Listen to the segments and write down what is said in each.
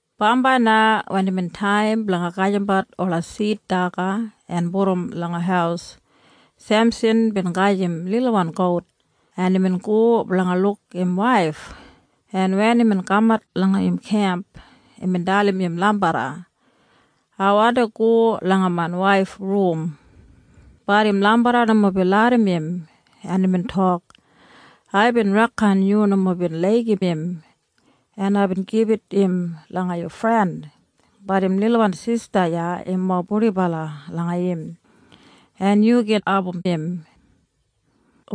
Bambai na wen imbin taim blanga gajimbat ola sid daga en pudum langa haus, Semsan bin gajim lilwan gout, en imbin go blanga luk im waif, en wen imbin kamat langa im kemp, imbin dalim im lambarra, “Ai wandi go langa main waif rum.” Bat im lambarra nomo bin larram im, en imbin tok, “Aibin reken yu nomo bin laigim im, en aibin gibit im langa yu fren. Bat im lilwan sista iya im mowa purdibala langa im, en yu gin abum im.”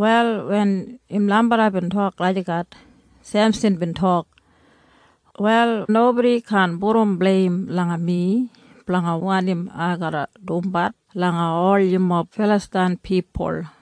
Wal wen im lambarra bin tok lagijat, Semsan bin tok, “Wal nobodi kaan pudum bleim langa mi blanga wanim ai garra dumbat langa ol yumob Filastain pipul!”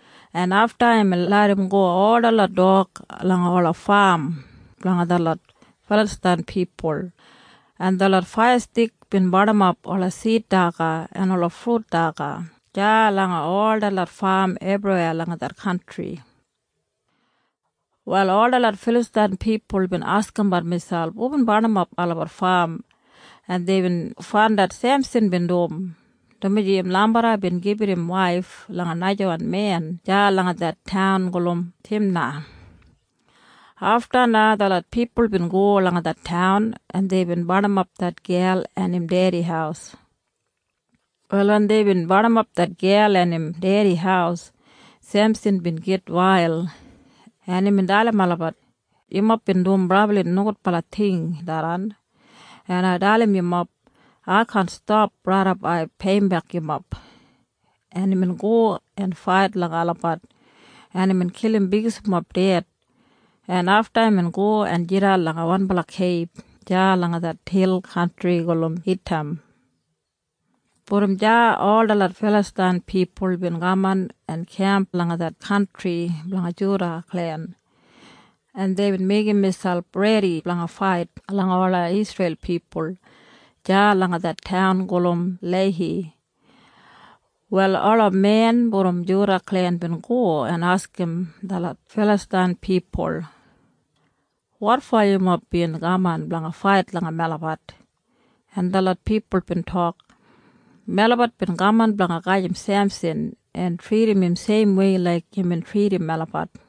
en afta imbin larram go ol detlot dog langa ola fam blanga detlot Filastain pipul, en detlot faiyastik bin barnimap ola sid daga en ola frut daga deya langa ol detlot fam ebriweya langa det kantri. Wal ol detlot Filastain pipul bin askimbat miselp hubin barnimap olabat fam, en deibin faindat Semsan bin dum, dumaji im lambarra bin gibit im waif langa najawan men deya langa det taun gulum Timna. Afta na detlot pipul bin go langa det taun, en deibin barnimap det gel en im dedi haus. Wal wen deibin barnimap det gel en im dedi haus, Semsan bin gitwail, en imbin dalim olabat, “Yumob bin dum brabli nogudbala ting tharran. En ai dalim yumob. Ai kaan stap raidap ai peiyimbek yumob.” En imbin go en fait langa olabat, en imbin kilim bigismob ded, en afta imbin go en jidan langa wanbala keib deya langa det hil kantri gulum Itam. Brom deya ol detlot Filastain pipul bin kaman en kemp langa det kantri blanga Juda klen, en deibin meigim miselp redibala blanga fait langa ola Isreil pipul deya langa det taun gulum Leihi. Wal ola men brom Juda klen bin go en askim detlot Filastain pipul, “Wotfo yumob bin kaman blanga fait langa melabat?” En detlot pipul bin tok, “Melabat bin kaman blanga gajim Semsan en tridim im seimwei laik imbin tridim melabat.”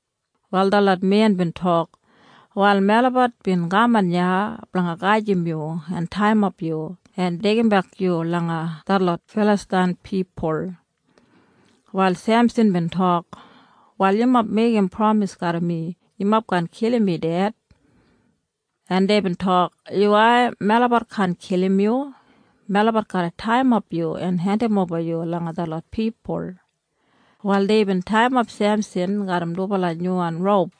Wal detlot men bin tok, “Wal melabat bin kaman iya blanga gajim yu en taiyimap yu en deigimbek yu langa detlot Filastain pipul.” Wal Semsan bin tok, “Wal yumob meigim pramis garram mi yumob kaan kilim mi ded.” En deibin tok, “Yuwai. Melabat kaan kilim yu. Melabat garra taiyimap yu en hendimoba yu langa detlot pipul.” Wal deibin taiyimap Semsan garram dubala nyuwan roup,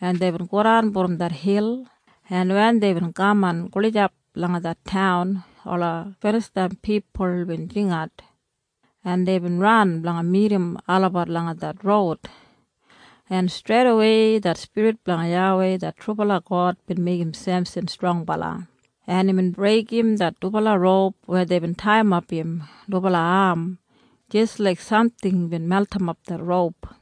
en deibin godan brom det hil, en wen deibin kaman gulijap langa det taun, ola Filastain pipul bin jingat, en deibin ran blanga midim olabat langa det roud, en streidawei det spirit blanga YAWEI det trubala God bin meigim Semsan strongbala, en imbin breigim det dubala roup weya deibin taiyimap im dubala am jis laik samting bin meltimap det roup,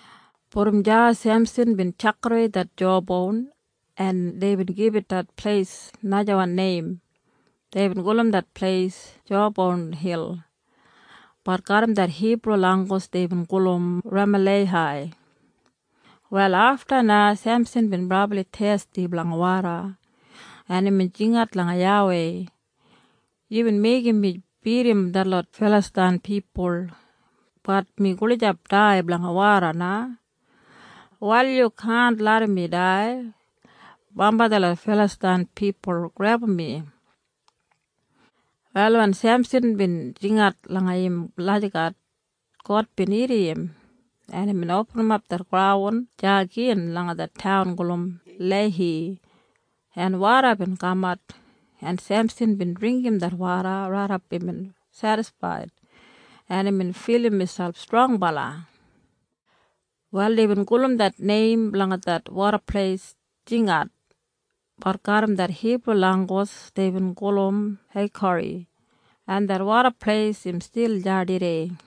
Brom deya Semsan bin tjakidawei det jauboun, en deibin gibit det pleis najawan neim. Deibin gulum det pleis Jauboun Hil. Bat garram det Hibru langgus deibin gulum Remaleihai. Wal afta na Semsan bin brabli thesti blanga woda, en imbin jingat langa YAWEI, “Yubin meigim mi bidim detlot Filastain pipul. Bat mi gulijap dai blanga woda na. Wal yu kaan larram mi dai. Bambai detlot Filastain pipul grebum mi.” Wal wen Semsan bin jingat langa im lagijat, God bin irrim im, en imbin opinim det graun deya gin langa det taun gulum Leihi, en woda bin kamat, en Semsan bin dringgim det woda raidap imbin sedisfaid, en imbin filim miselp strongbala. Wal deibin gulum det neim blanga det wodapleis Jingat. Bat garram det Hibru langgus deibin gulum Heikori. En det wodapleis im stil deya tudei.